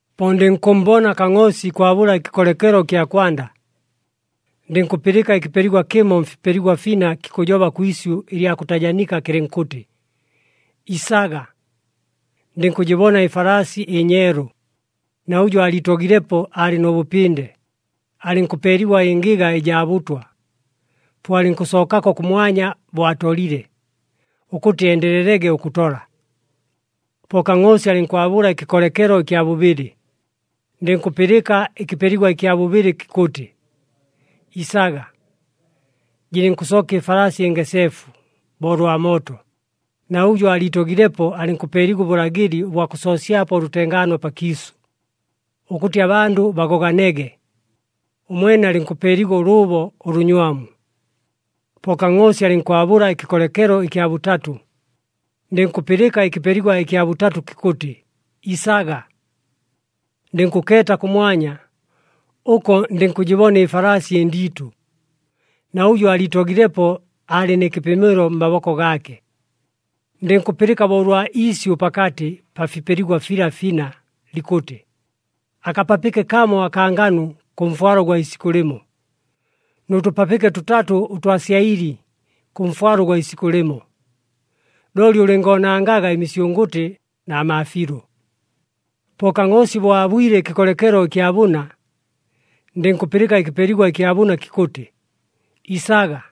Po ndɨnkʉmmbona Kangʼoosi ikwabʉla ɨkɨkolekelo ɨkya kwanda. Ndɨnkʉpɨlɨka ɨkɨpeligwa kɨmo mfipeligwa fina kikʉjoba kwi isyʉ ɨlya kʉtajanika kɨlɨnkʉtɨ, “Isaga!” Ndɨnkʉjɨbona ɨfalaasi ɨnyeelu, na ʉjʉ aaliitogilepo aalɨ nʉ bʉpɨnde, alɨnkʉpeeligwa ɨngɨga ɨjaa bʉtwa, po alɨnkʉsookako kʉmwanya bo atolile, ʉkʉtɨ endelelege ʉkʉtola. Po Kangʼoosi alɨnkwabʉla ɨkɨkolekelo ɨkya bʉbɨlɨ, ndɨnkʉpɨlɨka ɨkɨpeligwa ɨkya bʉbɨlɨ kikʉtɨ, “Isaga!” Jɨlɨnkʉsooka ɨfalaasi ɨngeseefu bo ʉlwa mooto, na ʉjʉ aaliitogilepo alɨnkʉpeeligwa ʉbʉlagɨli ʉbwa kʉsoosyapo ʉlʉtengaano pakiisʉ, ʉkʉtɨ abandʉ bagoganege. Ʉmwene alɨnkʉpeeligwa ʉlʉʉbo ʉlʉnywamu. Po Kangʼoosi alɨnkwabʉla ɨkɨkolekelo ɨkya bʉtatʉ, ndɨnkʉpɨlɨka ɨkɨpeligwa ɨkya bʉtatʉ kikʉtɨ, “Isaga!” Ndɨnkʉkeeta kʉmwanya. Ʉko ndɨnkʉjɨbona ɨfalaasi ɨndiitʉ, na ʉjʉ aaliitogilepo aalɨ nɨ kɨpɨmɨlo mmaboko gaake. Ndɨnkʉpɨlɨka bo ʉlwa iisyʉ pakatɨ pa fipeligwa fila fina, likʉtɨ, “Akapapɨke kamo akaa nganu kʉ mfwalo ʉgwa isikʉ lɨmo, nʉ tʉpapɨke tʉtatʉ ʉtwa syaɨli kʉ mfwalo ʉgwa isikʉ lɨmo, looli ʉlɨngoonangaga ɨmisyʉngʉtɨ na maafiilʉ.” Po Kangʼoosi bo aabwile ɨkɨkolekelo ɨkya bʉna, ndɨnkʉpɨlɨka ɨkɨpeligwa ɨkya bʉna kikʉtɨ, “Isaga!”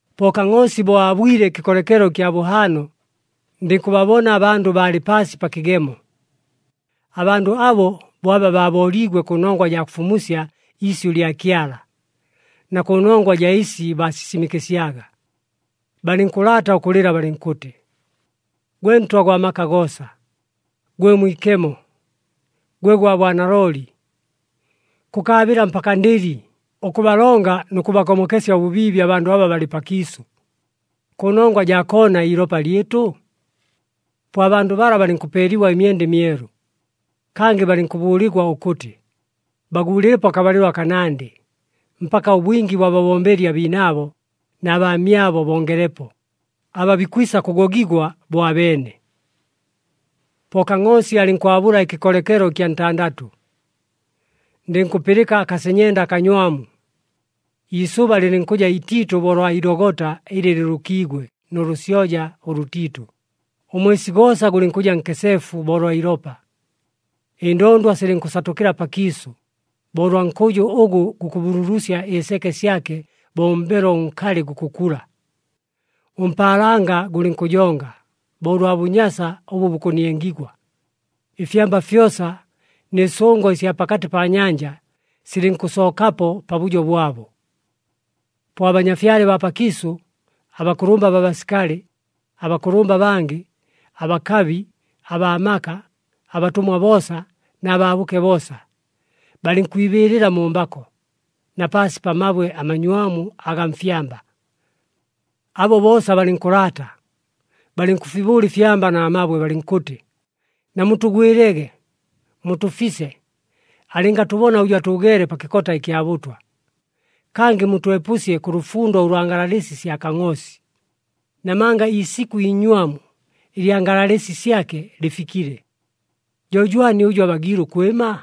Po Kangʼoosi bo aabwile ɨkɨkolekelo ɨkya bʉhaano, ndɨnkʉbabona abandʉ baalɨ paasi pa kɨgemo. Abandʉ abo bo aba baabooliigwe kʉnongwa jaa kʉfumusya iisyʉ lya Kyala, na kʉnongwa jaa ɨsi baasisimɨkɨsyaga. Balɨnkʉlaata ʉkʉlɨla balɨnkʉtɨ, “Gwe Ntwa gwa maka goosa, gwe Mwikemo, gwe gwa bwanalooli, kʉkaabɨla mpaka ndɨli, ʉkʉbalonga nʉ kʉbagomokesya ʉbʉbiibi abandʉ aba balɨ pakiisʉ, kʉnongwa jaa koona iilopa lyɨtʉ?” Po abandʉ bala balɨnkʉpeeligwa ɨmyenda ɨmyelu. Kangɨ balɨnkʉbʉʉligwa ʉkʉtɨ, baguulɨlepo akabalɨlo akanandɨ, mpaka ʉbwingi bwa babombeli abiinaabo na baamyabo bongelepo, aba bikwisa kʉgogigwa bo abeene. Po Kangʼoosi alɨnkwabʉla ɨkɨkolekelo ɨkya ntandatʉ, ndɨnkʉpɨlɨka akasenyenda akanywamu. Iisʉba lɨlɨnkʉja itiitʉ bo ʉlwa ilogota ɨlɨ lɨlʉkiigwe nʉ lʉsyoja ʉlʉtiitʉ, ʉmwesi goosa gʉlɨnkʉja nkeseefu bo ʉlwa ilopa. Ɨndondwa silɨnkʉsatʉkɨla pakiisʉ, bo ʉlwa nkʉjʉ ʉgʉ gukʉbululusya ɨseke syake bo ʉmbelo ʉnkalɨ gukʉkula. Ʉmpaalanga gʉlɨnkʉjonga, bo ʉlwa bʉnyasa ʉbʉ bukʉniengigwa. Ɨfyamba fyosa, nɨ sʉngo ɨsya pakatɨ pa nyanja silɨnkʉsookapo pabʉjo bwabo. Po abanyafyale baa pakiisʉ, abakʉlʉmba baa basikali, abakʉlʉmba abangɨ, abakabi, abaa maka, abatʉmwa boosa na baabʉke boosa, balɨnkwibɨɨlɨla mu mbako, na paasi pa mabwe amanywamu agaa mfyamba. Abo boosa balɨnkʉlaata, balɨnkʉfibʉʉla ɨfyamba na mabwe, balɨnkʉtɨ, “Namutʉgwɨlege, mutʉfise, alɨngatʉbona ʉjʉ atʉʉgeele pa kɨkota ɨkya bʉtwa. Kangɨ mutwepʉsye kʉ lʉfundo ʉlwa ngalalɨsi sya Kangʼoosi. Namanga iisikʉ iinywamu ɨlya ngalalɨsi syake lɨfikile. Jo jwani ʉjʉ abagiile ʉkwɨma?”